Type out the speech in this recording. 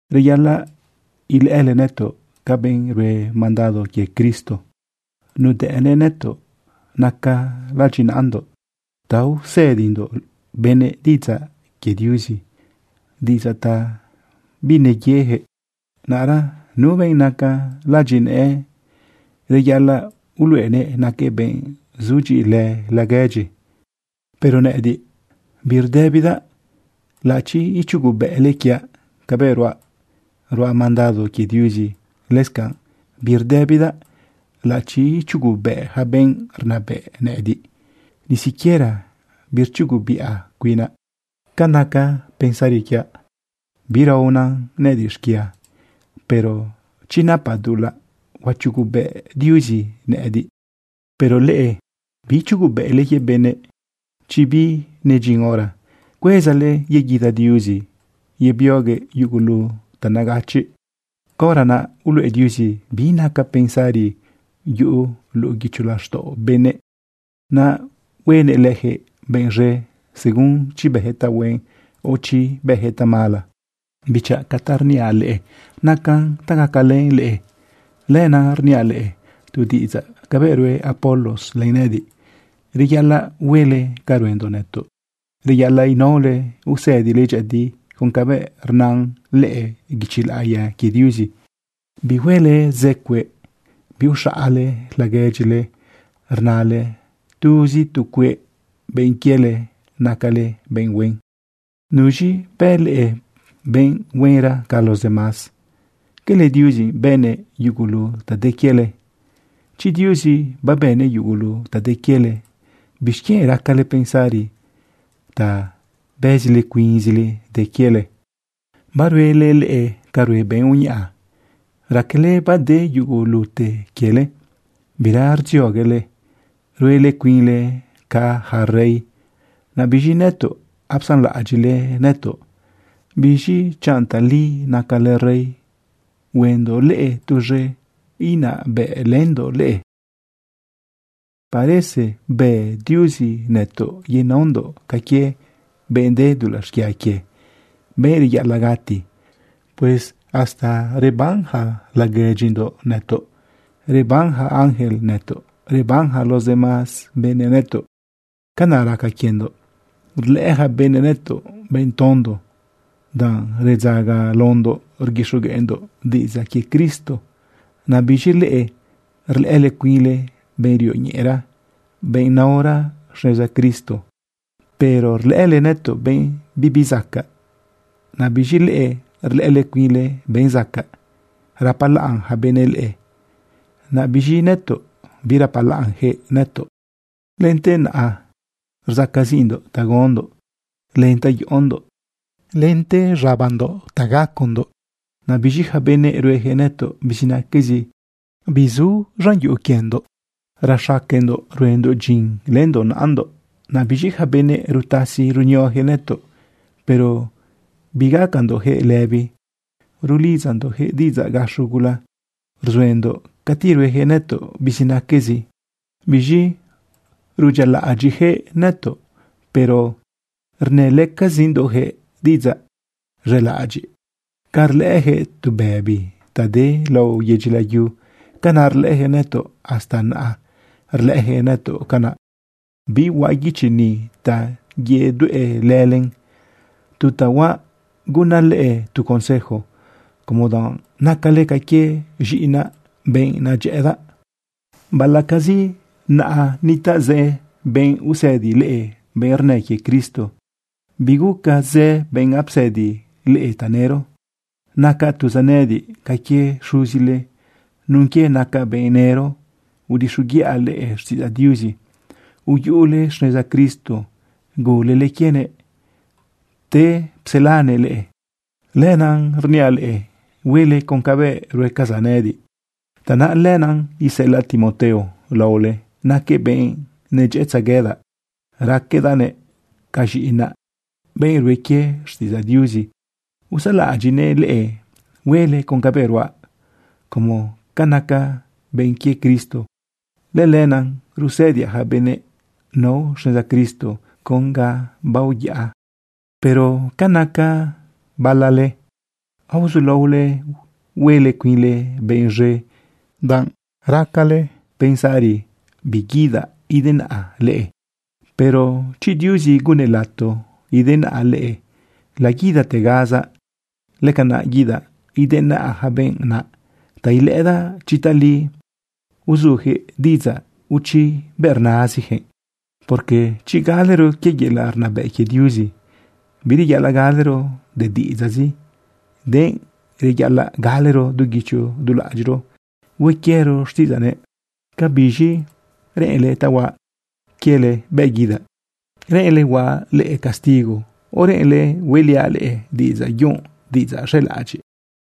Reyaꞌalaꞌ ilëꞌële nëtoꞌ ca benꞌ rue mandado quie Cristo. Nudëꞌnëꞌ nëtoꞌ naca ladyinaꞌandoꞌ ta usëdindoꞌ benëꞌ diꞌidzaꞌ quie Diuzi, diꞌidzaꞌ ta bineyejëꞌ. Naꞌra nu benꞌ naca ladyinëꞌë, reyaꞌalaꞌ uluꞌeguëꞌ naquëꞌ benꞌ zudyiꞌilë laguedyi. Pero nëꞌëdiꞌ birdëbidaꞌ laꞌachi ichugubëꞌle quiaꞌ cabëꞌ ruaꞌ, ruaꞌ mandado quie Diuzi. Lëscanꞌ birdëbidaꞌ laꞌachi ichugubëꞌ yaca benꞌ rnabëꞌ nëꞌëdiꞌ. Ni siquiera birchugubiꞌa cuinaꞌ. Ca naca pensari quiaꞌ, biraona nëꞌëdiꞌ xquia. Pero chi napaꞌ dulaꞌ, huachugubëꞌ Diuzi nëꞌëdiꞌ. Pero leꞌe, biichugubëꞌle quie benëꞌ chi binedyin hora. Cuezale yeguida Diuzi yebioguëꞌ yugulu ta negachiꞌ. Caora naꞌ uluꞌe Diuzi bi naca pensari yuꞌu luꞌu guicho laxtaꞌo benëꞌ, naꞌ huenëꞌ leyaquëꞌ benꞌ z̃e según chi bëjëꞌ tahuen, o chi bëjëꞌ tamala. Bichaꞌ, ca ta rniaꞌ leꞌe, nacan ta gacalën leꞌe. Lenaꞌ rniaꞌ leꞌe tu diꞌidzaꞌ cabëꞌ rue Apolos len nëꞌëdiꞌ. Reyaꞌalaꞌ huele ca ruendoꞌ nëtoꞌ. Reyaꞌalaꞌ inaole usëdile dyëꞌëdi con cabëꞌ rna lëꞌë guichi laꞌiya quie Diuzi. Bihuele zë cueꞌ. Biuxaꞌale laguedyile rnale tuzi tu cueꞌ benꞌ quiele nacale benꞌ huen. ¿Nuz̃i bë leꞌe benꞌ huenra ca los demás? ¿Cala Diuzi bënnëꞌ yugulu ta de quiele? Chi Diuzi babënnëꞌ yugulu ta de quiele, ¿bixquienꞌ racale pensari ta bëzile cuinzile de quiele? Baruele leꞌe ca rue benꞌ uñaꞌa. Raquele bade yugulute quiele, bira rdzioguele. Ruele cuinle ca yaca rey. Naꞌ biz̃i nëtoꞌ apsanlaꞌadyiꞌle nëtoꞌ. Biz̃i chanꞌ tali nacale rey, huendoꞌ leꞌe tuz̃e, inabëꞌlëndoꞌ leꞌe. Parece bë Diuzi nëtoꞌ yenaondoꞌ ca quie benꞌ de dulaꞌ xquia quie, benꞌ reyaꞌalaꞌ gati. Pues hasta reban yaca laguedyindoꞌ nëtoꞌ, reban yaca ángel nëtoꞌ, reban yaca los demás benëꞌ nëtoꞌ. Canaꞌ raca quiendoꞌ. Rlëꞌë yaca benëꞌ nëtoꞌ benꞌ tondo, danꞌ redzagalaondoꞌ rguixogueꞌndoꞌ diꞌidzaꞌ quie Cristo. Naꞌ biz̃i leꞌe rlëꞌële cuinle benꞌ rioñeꞌera, benꞌ naora xneza Cristo. Pero rlëꞌële nëtoꞌ benꞌ bibi zacaꞌ. Naꞌ biz̃i leꞌe rlëꞌële cuinle benꞌ zacaꞌ. Rapalaꞌn yaca benëꞌ leꞌe, naꞌ biz̃i nëtoꞌ birapalaꞌnyaquëꞌ nëtoꞌ. Lente naꞌa rsacaziꞌndoꞌ ta gaondoꞌ len ta yoꞌondoꞌ lente z̃abandoꞌ ta gacondoꞌ. Naꞌ biz̃i yaca benëꞌ rueyaquëꞌ nëtoꞌ bizinaquezi. Bisu lidyindoꞌ. Rexaquendoꞌ ruendoꞌ dyin lëndoꞌ naꞌandoꞌ. Naꞌ biz̃i yaca benëꞌ rutasi runioyaquëꞌ nëtoꞌ. Pero bigacandoꞌjëꞌ lëbi, rulidzandoꞌjëꞌ diꞌidzaꞌ gaxo gula. Rzuendoꞌ cati rueyaquëꞌ nëtoꞌ bizinaquezi. Biz̃i rudyialaꞌadyiꞌyaquëꞌ nëtoꞌ, pero rnëlëcazindoꞌjëꞌ diꞌidzaꞌ z̃elaꞌadyiꞌ. Ca rlëꞌëjëꞌ tu bëbi ta de lao yedyi layu, canaꞌ rlëꞌëjëꞌ nëtoꞌ. Hasta naꞌa rlëꞌëjëꞌ nëtoꞌ canaꞌ. Bihuaꞌ guichi ni ta yedueꞌlëlen. Tu ta huaꞌ gunnaꞌ leꞌe tu consejo como danꞌ nacale ca quie z̃iꞌinaꞌ, benꞌ nedyëꞌëdaꞌ. Baꞌalaꞌcazi naꞌa nitaꞌ zë benꞌ usëdi leꞌe, benꞌ rnë quie Cristo, biguca zë benꞌ apsëdi leꞌe tanëro. Nacaꞌ tuzaꞌ nëꞌëdiꞌ ca quie xuzile nun quie naca benꞌ nëro udixoguiꞌa leꞌe xtiꞌidzaꞌ Diuzi, uyuꞌule xneza Cristo gulele quienëꞌ, pte pselanëꞌ leꞌe. Lenaꞌ rniaꞌ leꞌe, huele con cabëꞌ ruecazaꞌ nëꞌëdiꞌ. Tanaꞌ lenaꞌ iseꞌelaꞌ Timoteo laole. Naquëꞌ benꞌ nedyëꞌëtzeguedaꞌ. Raquedaꞌnëꞌ ca z̃iꞌinaꞌ, benꞌ rue quie xtiꞌidzaꞌ Diuzi. Usalaꞌadyiꞌnëꞌ leꞌe huele con cabëꞌ ruaꞌ como ca nacaꞌ benꞌ quie Cristo. Lëlenaꞌ rusëdiaꞌ yaca benëꞌ nao xneza Cristo con ga baoyaꞌa. Pero ca naca bala leꞌe, aozulaole huele cuinle benꞌ z̃e danꞌ racale pensari biguidaꞌ idenaꞌa leꞌe. Pero chi Diuzi gunnëꞌ lato idenaꞌa leꞌe, laguidategazaꞌ. Lëcanaꞌ guidaꞌ idenaꞌa yaca benꞌ naꞌ ta ilëꞌëdaꞌ chi tali uzuyaquëꞌ diꞌidzaꞌ o chi bëꞌ rnaziyaquëꞌ. Porque chi galero quie yelaꞌ rnabëꞌ quie Diuzi, bireyaꞌalaꞌ galero de diꞌidzaꞌzi, denꞌ reyaꞌalaꞌ galero du guicho du laꞌadyiꞌro hue quiero xtiꞌidzaꞌnëꞌ. ¿Cabiz̃i reꞌenle ta huaꞌ quiele bëꞌ guidaꞌ? ¿Reꞌenle huaꞌ leꞌe castigo, o reꞌenle hueliaꞌ leꞌe diꞌidzaꞌ yunꞌ, diꞌidzaꞌ z̃elaꞌadyiꞌ?